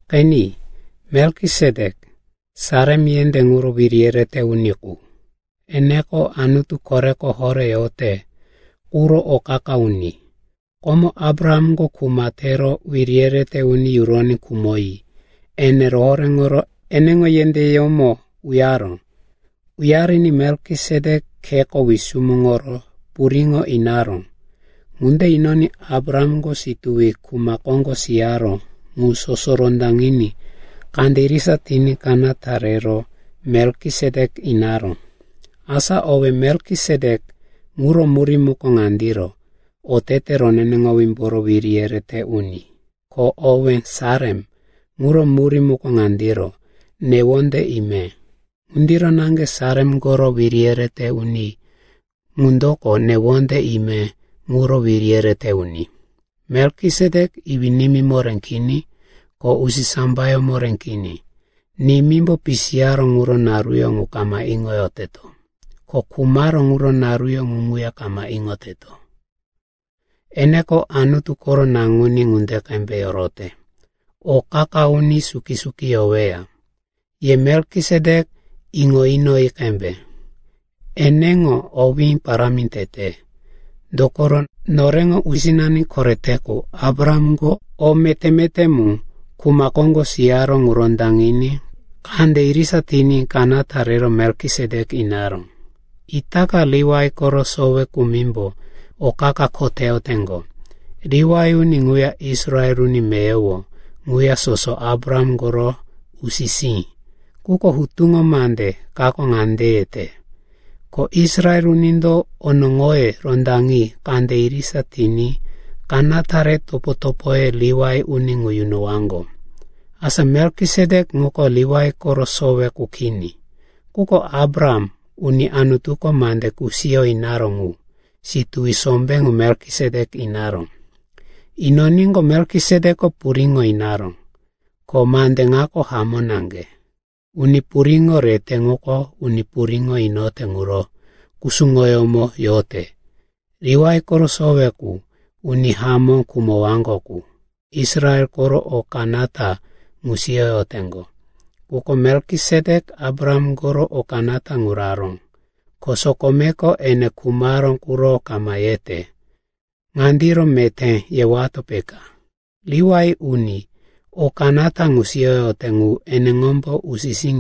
Qeni, Melkisetek, Salem yendé ŋuro wiri yerete uni qu, eneko Anutu Koreko Horé yote quro o qa-qa uni. Komo Abrahamko kuma tero wiri yerete uni yuroní khumoyi ene rohoréŋoro eneŋo yendéyómo uyaró. Uyariní Melkisetek kheko wisumuŋoro puriŋo inaró. Ŋunde inoní Abrahamko situwi kuma koŋgo siyaró ŋu soso rondaŋiní kande irisa tiní kanata rero Melkisetek inaró. Asa owé, “Melkisetek,” ŋuro murí muko ŋandiro, otete roneneŋowímboro wiri yerete uni. Ko owé, “Salem,” ŋuro murí muko ŋandiro, newonde ime. Ŋundiro naŋge Salem koro wiri yerete uni ŋundoko newonde ime ŋuro wiri yerete uni. Melkisetek iwí-nimí moré kini, ko usisambayó moré kini. Nimímbo pisiyaró ŋuro naruyó ŋu kama iŋoyoteto, ko khumaró ŋuro naruyó ŋu ŋuya kama iŋoyoteto. Eneko Anutu koro Naŋuní ŋunde qembe yorote. O qa-qa uni suki-suki yoweya. Ye Melkisetek iŋo inoyi qembe, eneŋo owí parámi tete. Dokoro noreŋo usinani korete qu Abrahamko o meté-meté mu kuma koŋgo siyaró ŋu rondaŋiní kande irisa tiní kanata re Melkisetek inaró. Itaka Liwai koro sowe kumimbo o qa-qa kho teyoteŋgo. Liwai uni ŋuya Israel uni meyowo ŋuya soso Abraham koro usi-sí. Quko hutuŋo mande kako ŋande yete, ko Israel unindo onoŋoye rondaŋi kande irisa tiní kanata re topo-topoye Liwai uni ŋu yunowaŋgo. Asa Melkisetek ŋuko Liwai koro sowe qu kini. Quko Abraham, uni Anutuko mande kusiyo inaró ŋu, situwi sombé ŋu Melkisetek inaró. Inoníqo, Melkisetekiko puriŋo inaró. Ko mande ŋako hamó naŋge, uni puriŋo rete ŋuko uni puriŋo inote ŋuro kusuŋoyómo yote. Liwai koro sowe qu, uni hamó khumowaŋgo qu, Israel koro o kanata ŋu siyoyoteŋgo. Quko Melkisetek Abraham koro o kanata ŋu raró, ko sokomeko ene khumaró quro kama yete. Ŋandiro meté yewato, peka, Liwai, uni o kanata ŋu siyoyote ŋu eneŋombo usi-sí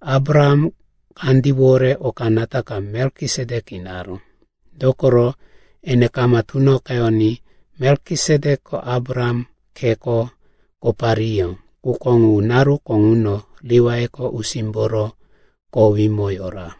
Abraham kandíwore o kanata ka Melkisetek inaró. Dokoro ene kama tunoqeyoní Melkisetekiko Abraham kheko kopariyó, quko ŋu naruko ŋuno Liwaiko usímboro kowímo yora.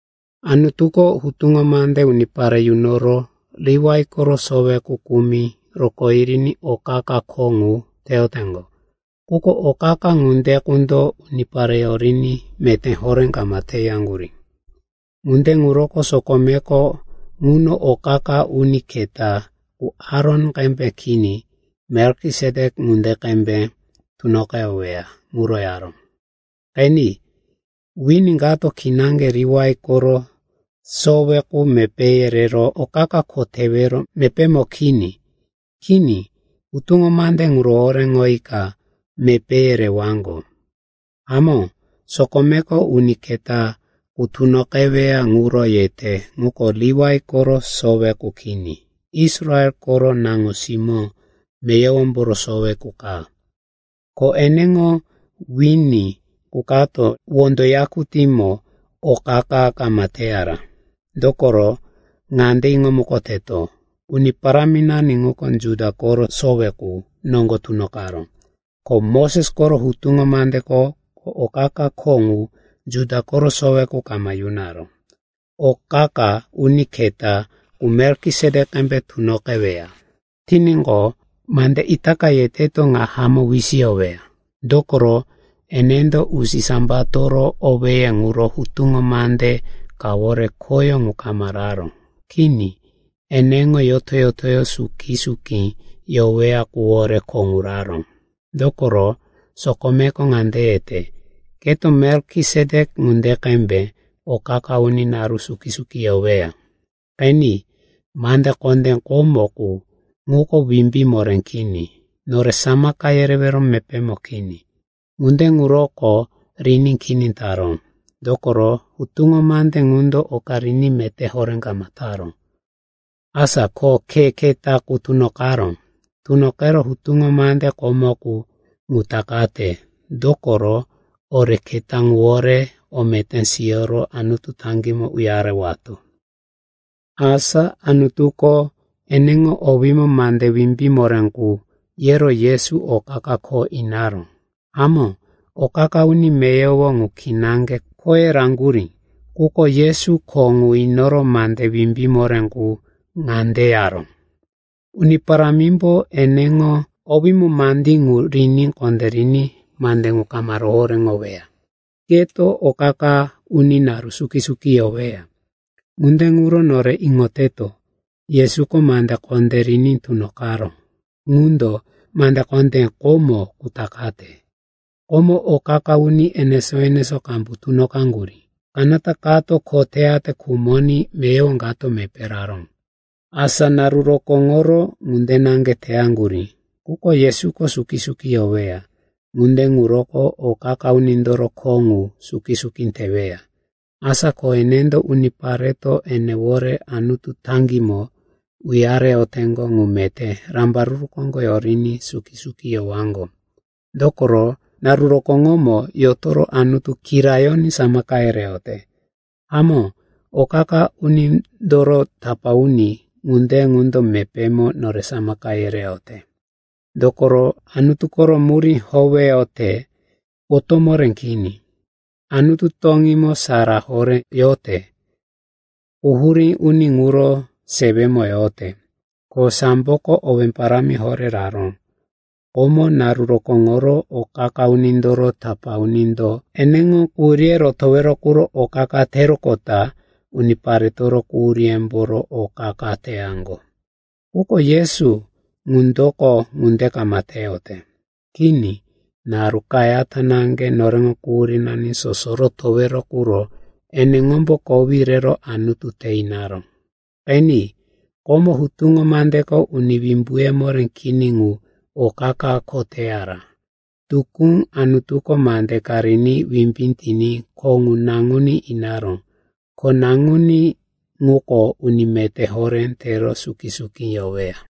Anutuko hutuŋo mande unipare yunoro Liwai koro sowe qu kumi rokó yiriní o qa-qa kho ŋu teyoteŋgo. Quko o qa-qa ŋunde qundo unipare yoriní meté horé kama teyaŋgurí. Ŋunde ŋuroko sokomeko ŋuno o qa-qa uni keta qu Aron qembe kini, Melkisetek ŋunde qembe tunoqeweya ŋuro yaró. Qeni, wini kato kinaŋge Liwai koro sowe qu mepéye rero o qa-qa kho tewero mepémo kini. Kini, hutuŋo mande ŋu rohoréŋoyika mepéye rewaŋgo. Hamó, sokomeko uni keta qu tunoqeweya ŋuro yete ŋuko Liwai koro sowe qu kini, Israel koro naŋo-simó meyowomboro sowe qu ka. Ko eneŋo wini qu kato wondo yakutímo o qa-qa kama teyara. Dokoro ŋande iŋomukoteto, Uni Paráminani ŋuko Juda koro sowe qu noŋgo tunoqaró. Ko Moses koro hutuŋo mandeko o qa-qa kho ŋu Juda koro sowe qu kama yunaró. Ko o qa-qa uni keta qu Melkisetek qembe tunoqeweya tiníqo, mande itaka yeteto ŋa hamó wisiyoweya. Dokoro enendo usisambatoro owéye ŋuro hutuŋo mande kawore khoyó ŋu kama raró. Kini eneŋo yoto-yoto suki-suki yoweya quwore kho ŋu raró. Dokoro sokomeko ŋande yete, “Keto Melkisetek ŋunde qembe o qa-qa uni naru suki-suki yoweya.” Qeni, mande kondé komo qu ŋuko wimbí moré kini, nore samaka yerewero mepémo kini. Ŋunde ŋuroko riní kini taró. Dokoro hutuŋo mande ŋundo oka riní meté horé kama taró. Asa ko khe keta qu tunoqaró. Tunoqero hutuŋo mande komo qu ŋu takate, dokoro ore keta ŋuwore o meté siyoro Anutu taŋgímo uyarewato. Asa Anutuko eneŋo owímo mande wimbí moré qu yero Yesu o qa-qa kho inaró. Hamó, o qa-qa uni meyowo ŋu kinaŋge khoye raŋgurí. Quko Yesu kho ŋu inoro mande wimbí moré qu ŋande yaró, “Uni Parámimbo eneŋo owímo mandí ŋu riní kondériní mande ŋu kama rohoréŋoweya. Keto o qa-qa uni naru suki-suki yoweya.” Ŋunde ŋuro nore iŋoteto, Yesuko mande kondé riní tunoqaró ŋundo mande kondé komo qu takate. Komo o qa-qa uni enesó-enesó qambu tunoqaŋgurí. Kanata kato kho teyate khumoní meyowo kato mepé raró. Asa naru rokóŋoro ŋunde naŋge teyaŋgurí. Quko Yesuko suki-suki yoweya. Ŋunde ŋuroko o qa-qa unindoro kho qu suki-suki teweya. Asa ko enendo unipareto enewore Anutu taŋgímo uyareyoteŋgo ŋu meté rambaruru koŋgo yoriní suki-suki yowaŋgo. Dokoro naru rokóŋomo yotoro Anutu kirayoní samaka yereyote. Hamó, o qa-qa unindoro tapá uni ŋunde qundo mepémo nore samaka yereyote. Dokoro Anutu koro murí howeyote, potó moré kini, Anutu toŋímo sara horé yote, quhurí uni ŋuro sewemo yote. Ko samboko owé parámi horé raró. Komo, naru rokóŋoro o qa-qa unindoro tapá unindo eneŋo quhuríye rotowero quro o qa-qa teroqota uniparetoro quhuríyemboro o qa-qa teyaŋgo. Quko Yesu ŋundoko ŋunde kama teyote. Kini. Naru kayata naŋge noreŋo quhurínani soso rotowero quro eneŋombo kowí rero Anutu te inaró. Qeni, komo hutuŋo mandeko uni wimbuye moré kini ŋu o qa-qa kho teyara. Tukú Anutuko mande ka riní wimbí tiní kho ŋu Naŋuní inaró. Ko Naŋuní ŋuko uni meté horé tero suki-suki yoweya.